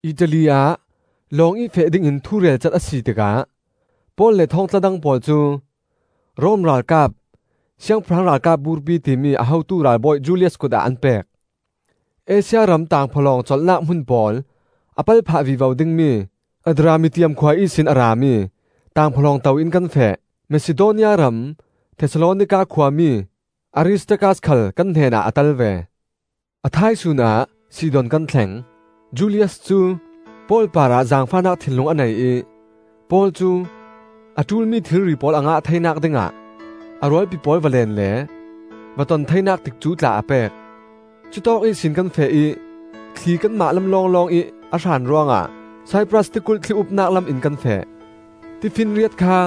Italy ah lawng ih feh dingin thu relcat a si tikah Paul le thawngtla dang pawl cu Rom ralkap “Siangpahrang Ralkap Burpi,” timi a hotu ralbawi Julius kutah an pek. Asia ram tangphawlawng colhnak hmun pawl a pal phah vivo ding mi Adramittium khua ihsin a rami tangphawlawng to in kan feh. Masidonia ram Thesalonika khuami Aristarkas khal kan hnenah a tel ve. A thaisun ah Sidon kan thleng. Julius cu Paul parah zaangfahnak thinlung a nei ih Paul cu a ṭulmi thilri pawl a ngah theinak dingah a rualpi pawl va leen le va ton theinak tikcu tla a pek. Cutawk ihsin kan feh ih thli kanmah lam lawnglawngih a hran ruangah Saipras tikulh thli-upnak lam in kan feh. Tifinriat kha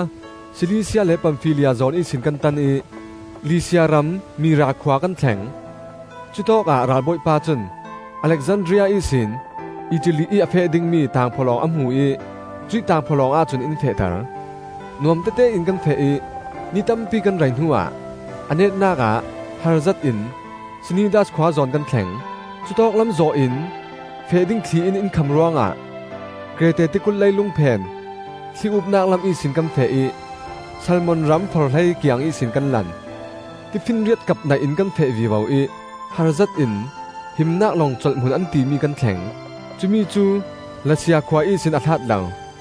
Silisia le Pamfilia zawn ihsin kan tan ih Lisia ram Mira khua kan thleng. Cutawkah ralbawipa cun Alexandria ihsin Italy ih a feh dingmi tangphawlawng a hmu ih cuih tangphawlawng ahcun in fehter. Nuamtete in kan feh ih ni tampi kan rei hnuah a netnak ah harzet in Snidas khua zawn kan thleng. Cutawklam zawh in feh ding thli in in kham ruangah Krete tikulh leilung phen thli-upnak lam ihsin kan feh ih Salmon ram-forhlei kiang ihsin kan lan. Tifinriat kap naih in kan feh vivo ih harzet in Himnak Longcolh Hmun an timi kan thleng. Cumi cu La sia khua ihsin a hlat lo.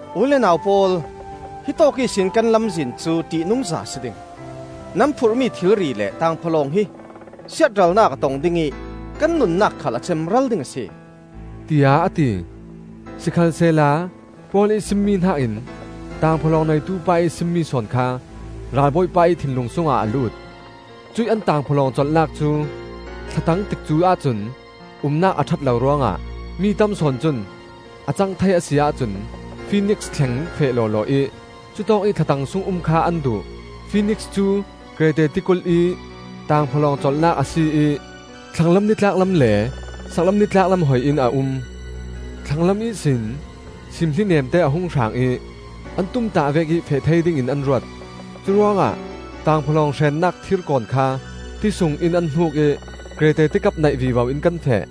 “U le nau pawl, hi tawk ihsin kan lamzin cu ṭihnungza a si ding. Nan phurhmi thilri le tangphawlawng hi siatralnak a tong ding ih kan nunnak khal a cemral ding a si,” tiah a ti. Sikhalsehla Paul ih simmi hnakin tangphawlawng neitupa ih simmi sawn kha ralbawipa ih thinlung sungah a lut. Cuih an tangphawlawng colhnak cu thlatang tikcu ahcun umnak a ṭhat lo ruangah mi tam sawn cun a cang thei a si ahcun Finiks thleng feh lawlaw ih cutawkih thlatang sung um kha an duh. Finiks cu Krete tikulh ih tangphawlawng colhnak a si ih thlanglam nitlaknak lam le saklam nitlaknak lam hoi in a um. Thlanglam ihsin simthli neemte a hung hrang ih an tumtah vekih feh thei dingin an ruat. Curuangah tangphawlawng hrennak thirkawn kha ti sungin an hnuk ih Krete tikap naih vivo in kan feh.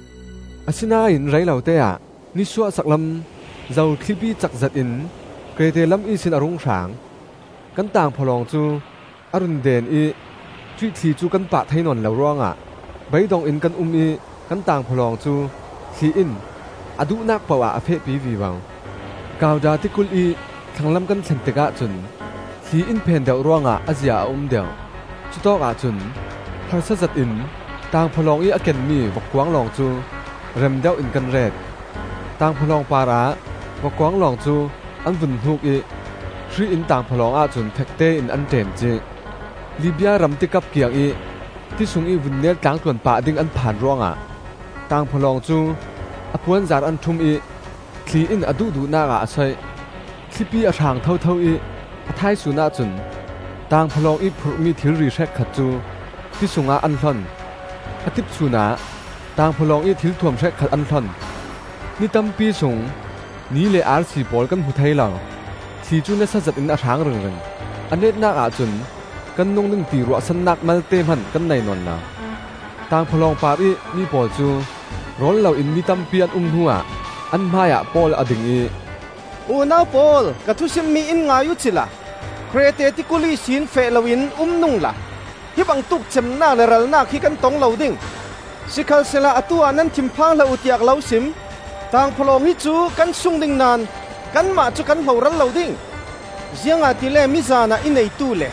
Asinain rei lote-ah, “Nisuah Saklam Zothlipi,” cak zetin Krete lam ihsin a rung hrang. Kan tangphawlawng cu a run deen ih cuih thli cu kan pah thei nawn lo ruangah beidong in kan um ih kan tangphawlawng cu thli in a duhnak poh ah a fehpi vivo. Kauda tikulh ih thlanglam kan thlen tikah cun thli in phen deuh ruangah a zia a um deuh. Cutawkah cun harsa zetin tangphawlawng ih a kenmi vokkuanglawng cu rem deuhin kan ret. Tangphawlawng parah vokkuanglawng cu an vun hnuk ih hri in tangphawlawng ahcun fektein an ṭemcih. Libia ram tikap kiangih ti sungih vunnel tlangtluan pah ding an phan ruangah tangphawlawng cu a puanzar an ṭhum ih thli in a duhduhnak ah a so ih. Thlipi a hrang thotho ih a thaisun ahcun tangphawlawng ih phurhmi thilri hrekkhat cu ti sungah an hlon. A tipsun ah tangphawlawng ih thilthuam hrekkhat an hlon. Ni tampi sung, ni le arsi pawl kan hmu thei lo; thli cu nasa zetin a hrang ringring. A netnak ahcun kan nung ding ti ruahsannak malte hman kan nei nawn lo. Tangphawlawng parih mi pawl cu rawl loin ni tampi an um hnuah an hmaiah Paul a ding ih, “Unau pawl, ka thusimmi in ngai uhcila Krete tikulh ihsin feh loin um nungla hi bangtuk cemnak le ralnak hi kan tong lo ding. Sikhalsehla atu-ah nan thinphang hlah uh, tiah ka lo sim. Tangphawlawng hi cu kan sung ding naón kanmah cu kan hloral lo ding. Ziangahtile mizanah i neitu le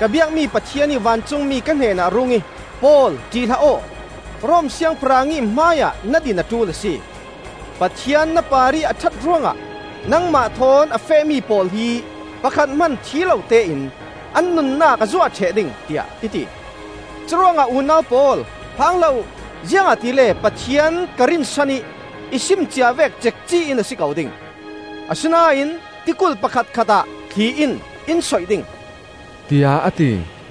ka biakmi Pathian ih vancungmi ka hnenah a rung ih, ‘Paul, ṭih hlah aw! Rom siangpahrang ih hmaiah na din a ṭul a si! Pathian na parih a ṭhat ruangah nangmah thawn a fehmi pawl hi pakhat hman thi lotein an nunnak a zuah ṭheh ding,’ tiah i ti. Curuangah unau pawl, phang hlah uh! Ziangahtile Pathian ka rinsan ih i sim cia vek cekci in a si ko ding. Asinain tikulh pakhatkhatah thli in in soih ding,” tiah a ti.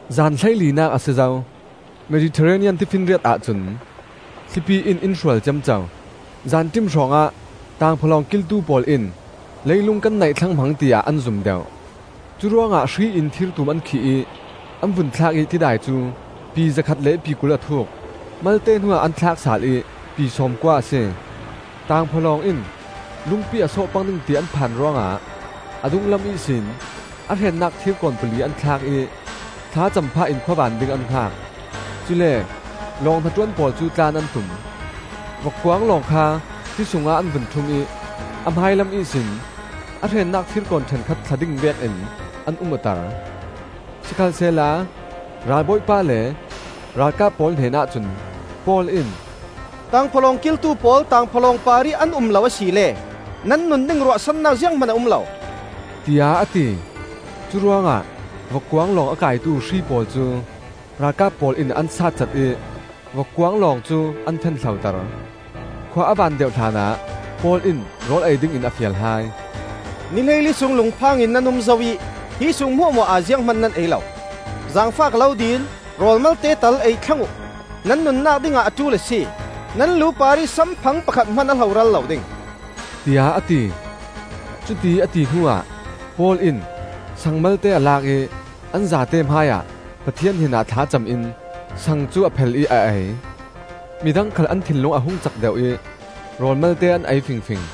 Zan hleilinak a si zo, Mediterranean Tifinriat ahcun thlipi in in hrual ciamco. Zanṭim hrawngah tangphawlawng kiltu pawl in leilung kan naih thlang hmang tiah an zum deuh. Curuangah hri in thirtum an khih ih an vun thlak ih tidai cu pi zakhat le pi kul a thuuk. Malte hnuah an thlak sal ih pi sawmkua a si. Tangphawlawng in lungpi a sawh pang ding ti an phan ruangah a dunglam ihsin a hrennak thirkawn pali an thlak ih thlacam phahin khuavan ding an hngak. Cule lawng hnaṭuan pawl cu tlan an tum; vokkuanglawng kha ti sungah an vun ṭhum ih a hmailam ihsin a hrennak thirkawn ṭhenkhat thla ding vekin an um awter. Sikhalsehla ralbawipa le ralkap pawl hnenah cun Paul in, “Tangphawlawng kiltu pawl tangphawlawng parih an um lo asile nan nun ding ruahsannak zianghman a um lo,” tiah a ti. Curuangah vokkuanglawng a kaitu hri pawl cu ralkap pawl in an satcat ih vokkuanglawng cu an fen hloter. Khua a van deuh hlanah Paul in rawl ei dingin a fial hai: “Ni hleili sung lungphangin nan um zo ih hi sung hmuahhmuah ah zianghman nan ei lo. Zaangfah ka lo dil: rawl malte tal ei thlang uh. Nan nunnak dingah a ṭul a si. Nan lu parih samphang pakhat hman a hloral lo ding,” tiah a ti. Cutiih a ti hnuah Paul in saang malte a lak ih an zate hmaiah Pathian hnenah thlacam in saang cu a phel ih a ei. Midang khal an thinlung a hung cak deuh ih rawl malte an ei fingfing.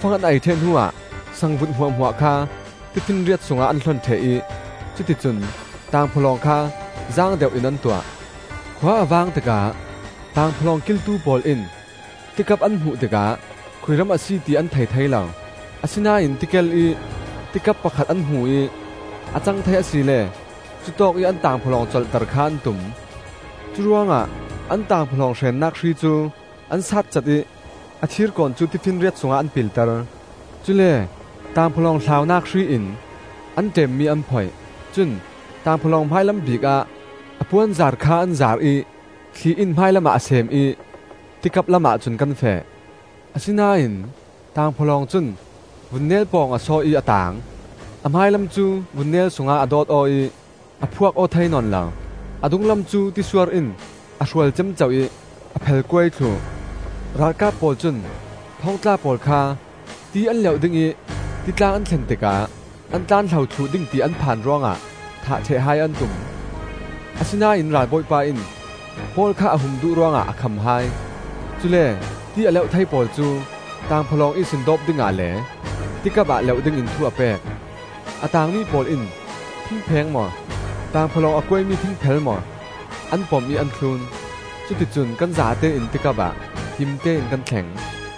Tawkfang an ei ṭheh hnuah sangvut hmuahhmuah kha tifinriat sungah an hlon ṭheh ih cuti cun tangphawlawng kha zaang deuh in an tuah. Khua a vang tikah tangphawlawng kiltu pawl in tikap an hmuh tikah khui ram a si ti an thei thei lo. Asinain tikel ih tikap pakhat an hmu ih a cang thei asile cutawkih an tangphawlawng colhter kha an tum. Curuangah an tangphawlawng hrennak hri cu an satcat ih a thirkawn cu tifinriat sungah an pilter; cule tangphawlawng hlaunak hri in an ṭemmi an phoih. Cun tangphawlawng hmailam bikah a puanzar kha an zaar ih thli in hmailam ah a sem ih tikap lamah cun kan feh. Asinain tangphawlawng cun vunnel pawng a sawh ih a taang. A hmailam cu vunnel sungah a dawt aw ih a phuak aw thei nawn lo; a dunglam cu tisuar in a hrual ciamco ih a phel kuai thluh. Ralkap pawl cun thawngtla pawl kha ti an leuh ding ih titlang an thlen tikah an tlanhlo thluh ding ti an phan ruangah thah ṭheh hai an tum. Asinain ralbawipa in Paul kha a hum duh ruangah a kham hai. Cule ti a leuh thei pawl cu tangphawlawng ihsin dawp dingah le tikap ah leuh dingin thu a pek. A taangmi pawl in thingpheng maw, tangphawlawng a kuaimi thingphel maw, an pom ih an thlun. Cuti cun kan zatein tikap ah himte in kan thleng.